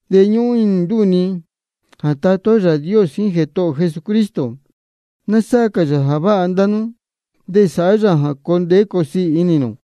De ñúhún inī ndúū ni jā Tatá ó Yāā Dios jíín Jētohō ō Jesucristo, ná sáhá cā yā jā váha ndá nú, de sāhá yā jā coo ndeé coo siī inī nū.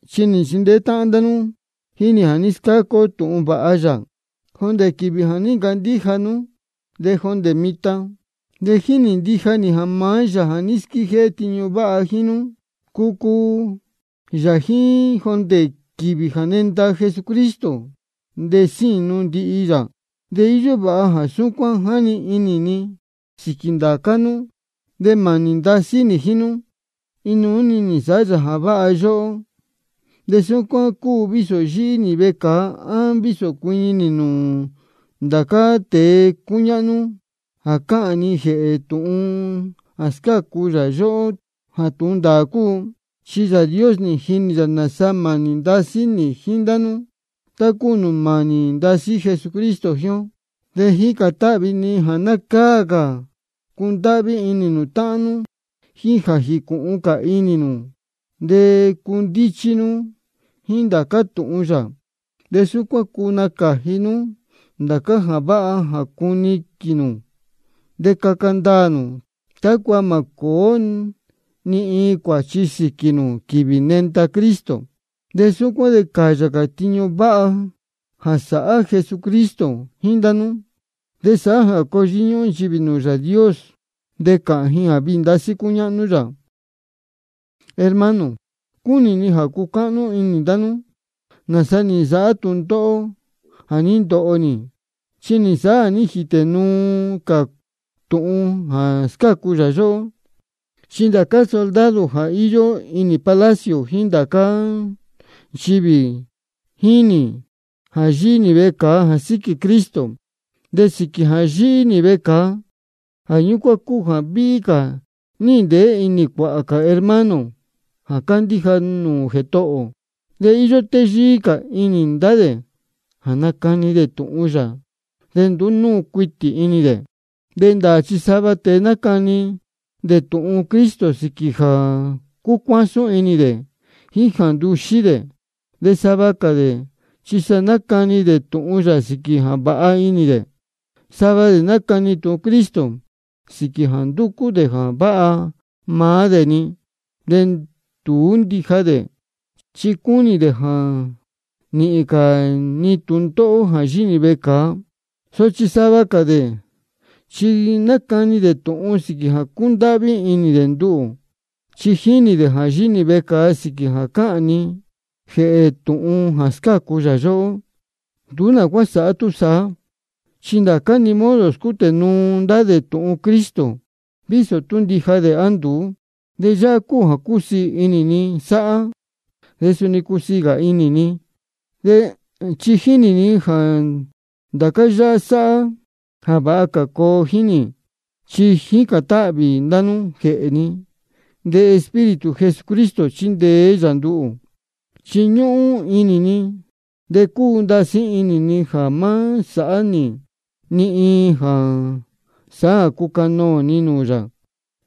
Chi nī nchindeé táhán ndá nú jíín nī jā scáca ó tūhun vāha yā, jondē quīvī jā ní ncandíja nú de jondē mitan. De jínī ndija nī jā maá Yāā jā ní squíjéhé tiñu váha jíín nú, cucuu yā jíín jondē quīvī jā nenda Jesucristo, de sínu ndihi yā. De íyó vāha jā súcuán jáni inī ni sīquī ndācá nú, chi mānī ndasí nī jíín nú, de inuú-ni nī nsāhá yā jā váha yóhó. De súcuán cúu vísō yíhí nī vecāa á vísō cuiñi nī nūū ndācá tēe cúñáhnú jā cāhān ni jēhē tūhun jā scácu yā yóhó jā tūhun ndāā cúu. Chi Yāā Dios jínī yā nāsa mānī ndasí nī jíín ndá nú, tá cúu nūū mānī ndasí Jesucristo jíín ó. De jícān táhvī ni jā ná cáa cā cundáhví inī nū táhán nú, jíín jā jīcūhun cā inī nū de cundíchí nú jíín ndācá tūhun yā. De súcuán de cuu nacāji nú ndācá jā váha jā cuniquīn nū, de caca ndaā nū, tácua mā cōó ni iin cuāchi sīquī nū quīvī jā nenda Cristo. De súcuán de cāyā cuāhā tiñu váha jā sāhá Jesucristo jíín ndá nú. De sāhá jā coo yíñúhún nchivī nūū Yāā Dios de cāhān ji jā viī ndasí cúñáhnú yā. Hermano, cúnī ni jā ná cúcáhnú inī ndá nú nāsa nī nsāhá tūndóhó jā ní ndoho nī. Chi nī nsāhá jā ní jītē nuu cā tūhun jā scácu yā yóhó. Chi ndācá soldado jā íyó inī palacio, jíín ndá cā nchivī, jínī ji jā yíhí nī vecāa jā síquī Cristo. De sīquī jā yíhí nī vecāa, jā ñúcuán cúu jā víhí cā níhīn ndeé inī cuāhā hermano jā cándíja nūū Jētohō ō. De íyó téyíí cā inī ndá dē jā nácani dē tūhun yā, de nduú núu cuitī inī dē. De ndāā chi sava tēe nácani dē tūhun Cristo sīquī jā cúcuásún inī dē jíín jā nduxí dē. De sava cā dē chi sa nácani dē tūhun yā sīquī jā vāha inī dē. Sava dē nácani tūhun Cristo sīquī jā ndúcú dē jā váha maá dē-ni, de nduú ndija dē, chi cúnī dē jā nīhīn cā ni tūndóhó jā yíhí nī vecāa. Sochi sava cā dē chi nácani dē tūhun sīquī jā cúndáhví inī dē nduhū, chi jínī dē jā yíhí nī vecāa sīquī jā cáhān ni jēhē tūhun jā scácu yā yóhó. Nduú nā cuá sāhá túsaá, chi ndācá-ni modo scútē nuu ndá dē tūhun Cristo, vísō tú ndija dē á nduú. De yáhá cúu jā cúsiī inī ni sáhá. De suni cusiī cā inī ni, chi jínī ni jā ndācá yáhá sáhá jā vāha cā coo jíín nī, chi jícān táhvī ndá nú jēhē ni, de Espíritu Jesucristo chíndeé yā nduhū. Chi ñúhún inī ni de cúu ndasí inī ni jā má sāhá nī ni iin jā sāhá jā cucanoō ni nūū yā.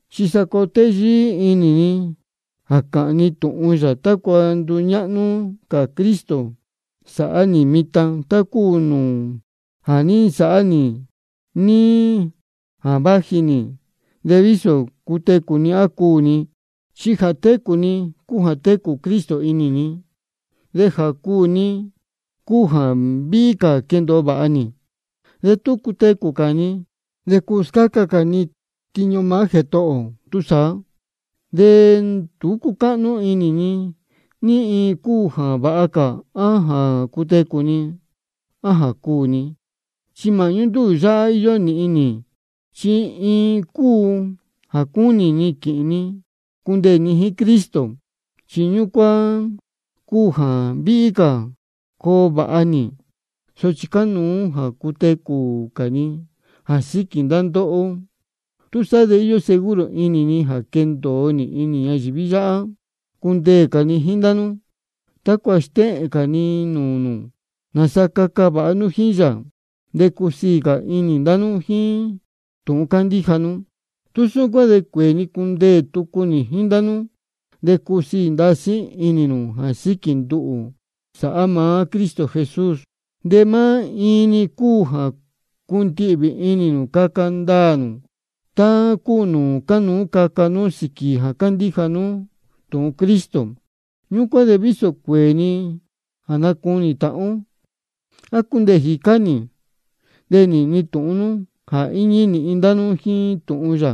Chi sa coo téyíí inī ni jā cāhān ni tūhun yā, tácua nduñáhnú cā Cristo sāhá nī mitan, tá cúu nūū ja nī nsāhá nī níí jā váji nī, de vísō cutecū ni á cuū ni. Chi jā técū ni cúu jā técū Cristo inī ni, de jā cuū ni cúu jā víhí cā quendōo vāha nī. De tú cutecū cā ni, de cuu scáca cā ni tiñu maá Jētohō ō. Túsaá de nduú cúcáhnú inī ni ní iin cúu jā váha cā, á jā cutecū ni á jā cuū ni. Chi māhñú ndúū tūhun yáhá íyó nīhin nī. Chi iin cúu jā cúnī ni quīhīn ni cundeē ni jíín Cristo, chi ñúcuán cúu jā víhí cā coo vāha nī. Sochi cánuú cā jā cutecū cā ni jā síquī ndá ndóhó. Túsaá de íyó seguro inī ni jā quendōo nī ñayīví yáhá cundeē cā ni jíín ndá nú, tácua stéhēn cā ni nūū nū nāsa caca vāha cā nū jíín yā, de cusiī cā inī ndá nú jíín tūhun cándíja nú. Tú súcuán de cuēē ni cundeē tucu nī jíín ndá nú, de cusiī ndasí inī nū jā síquī nduhū, sāhá maá Cristo Jesús. De maá iin-ni cúu jā cundihvī inī nū caca ndaā nū, tá cúu nūū cánuú caca nú sīquī jā cándíja nú tūhun Cristo. Ñúcuán de vísō cuēē ni jā nacunī tāhán ó, á cundeē jīcá nī, de nīhīn ni tūhun nú jā íñí nīhin ndá nú jíín tūhun yā,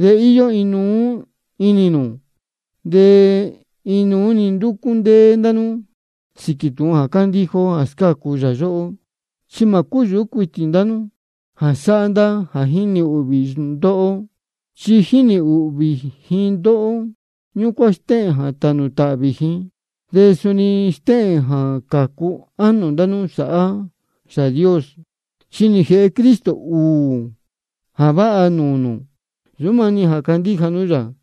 de íyó inuú inī nū, de inuú-ni ndúcú ndéé ndá nú sīquī tūhun jā cándíja ó jā scácu yā yóhó. De mā cúyūhú cuitī ndá nú jā sáhá ndá jā jínī ūhvī ndóhó. Chi jā jínī ūhvī ji ndóhó, ñúcuán stéhēn jā tānū tāhvī ji, de suni stéhēn jā cācu ánō ndá máá nú sāhá Yāā Dios. Chi nī jēhe Cristo ūū jā váha nūū nū: Nsūú maá-ni jā candíja nú yā,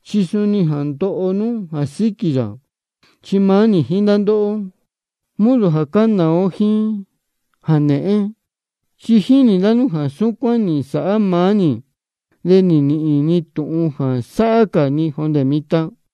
chi suni jā ndoho nú jā síquī yā. Chi maá nī jíín ndá ndóhó, modo jā cánāá ó jíín ndācá jā nēhén. Chi nī jinī ndá nú jā súcuán nī nsāhá maá nī, de níhīn nū tūhun jā sáhá cā ni jondē mitan.